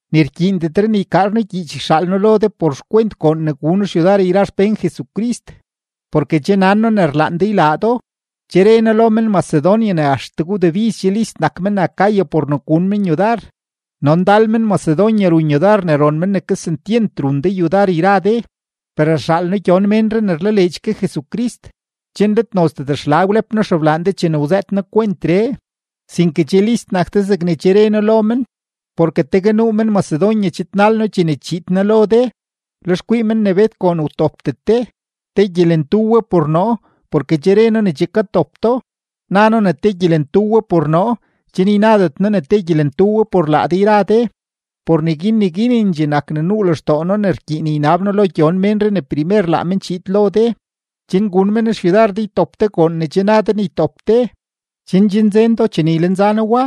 Ni rkyiindetre ne ykaar noo gyiich yxaal noo lo de por xkwent goon ne gun xyudar yra xpén Jesucrist, porke che nan noo ne rlaan de ylaa do. Che re noo lo men-Macedonia ne axtegue wdebiz che list nak men-Acaya por ne gun men yudar, no ndal men-Macedonia run yudar ne ron men ne kesentyent run de yudar yra de. Per rxaal noo gyon ménree ne rlaleedx ke Jesucrist, chen let nozdet xla wlep noo xeblaan de chene wzëët noo kwentree, sinke che list nak de zegne che re noo lo men. Porke tegue nuu men-Macedonia chidnal noo chene chiid noo lo de, lex kwii men ne bet goon wtopdet de, te gyelentu we por noo porke che re noo ne che katop do; na noo ne te gyelentu we por noo chen ynadet noo ne gyelentu we por laa de yra de. Por neguin neguinendxee nak ne nuu lextoo noo ne rkyiin ynab noo lo gyon ménree ne primer laa men chiid lo de, chen gun men xyudar de ytop de goon ne che na de ne ytop de, chen che nzen do chene ylenza noo wa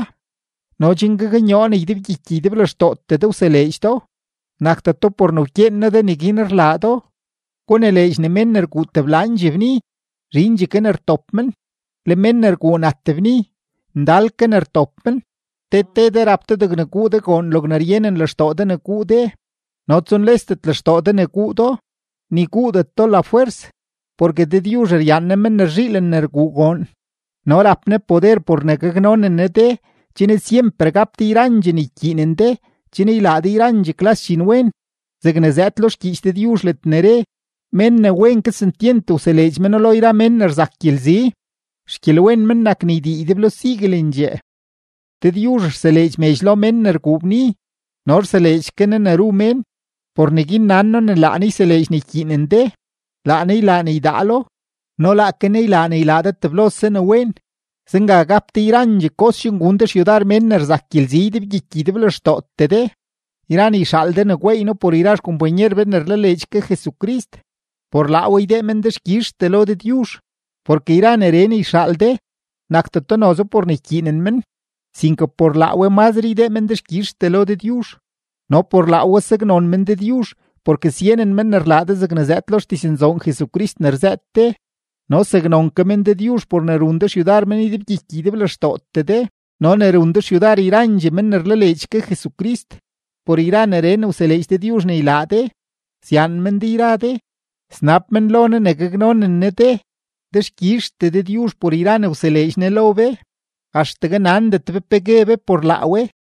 no chen gaknyoo ne ydebgyiky ydeblextootee de wseleedx do, nakdeto por ne wkyeen noo de neguin rlaa do. Gunileedx ne mén ne rguu teblandxee bni, zhindxee ke ne rtop men, le mén ne rguu nat bni, ndal ke ne rtop men. Te te de rap de degne guu de goon logne ryenen lextoo de ne guu de no tsunyaandet lextoo de ne guu do, ni guudet do lafwers, porke Dëdyuzh ryaan Ne men ne rzhiilen rguu goon. No rap Ne poder por ne gaknonen Ne de chen syemper gap de yrandxee ne rkyiinen de chen ylaa de yrandxee klas dxinwen, zegne zëëd lo xgyiich Dëdyuzh ledne re: Mén ne wen kesentyent wseleedx meno lo yra mén ne rzak gyelzi, xgyelwen men nak ne ydii ydeblo siguelendxee. Dëdyuzh rseleedx medx lo mén ne rguu bni no rseleedx ke Ne ne ru mén; por neguin nan noo ne laa Ne yseleedx ne ykyiinen de, laa Ne ylaa ne ydaalo, no laake Ne ylaa ne ylaa de teblose ne wen. Zenga gap de yrandxee kos chen gun de xyudar mén ne rzak gyelzi ydebgyiky ydeblextootee de. Yra ne yxaal de ne gweey noo por yra xkompanyer be ne rlaleedx ke Jesucrist, por laa we ydee men dexkyizhtee lo Dëdyuzh. Porke yra neree ne yxaal de, nakdeto noze por ne ykyiinen men, sinke por laa we mazre ydee men dexkyizhtee lo Dëdyuzh. No por laa we saknon men Dëdyuzh porke syenen men ne rlaa de zegne zëëd lo xdiznzoon Jesucrist ne rzëët de, no saknon ke men Dëdyuzh por ne run de xyudar men ydebgyiky ydeblextootee de no ne run de xyudar yrandxee men ne rlaleedx ke Jesucrist. Por yra neree ne wseleedx Dëdyuzh ne ylaa de, syaan men de yra de, snab men lo Ne ne gaknonen Ne de. Dexkyizhtee Dëdyuzh por yra ne wseleedx Ne lo be, axtegue nandet be pe gue be por laa we.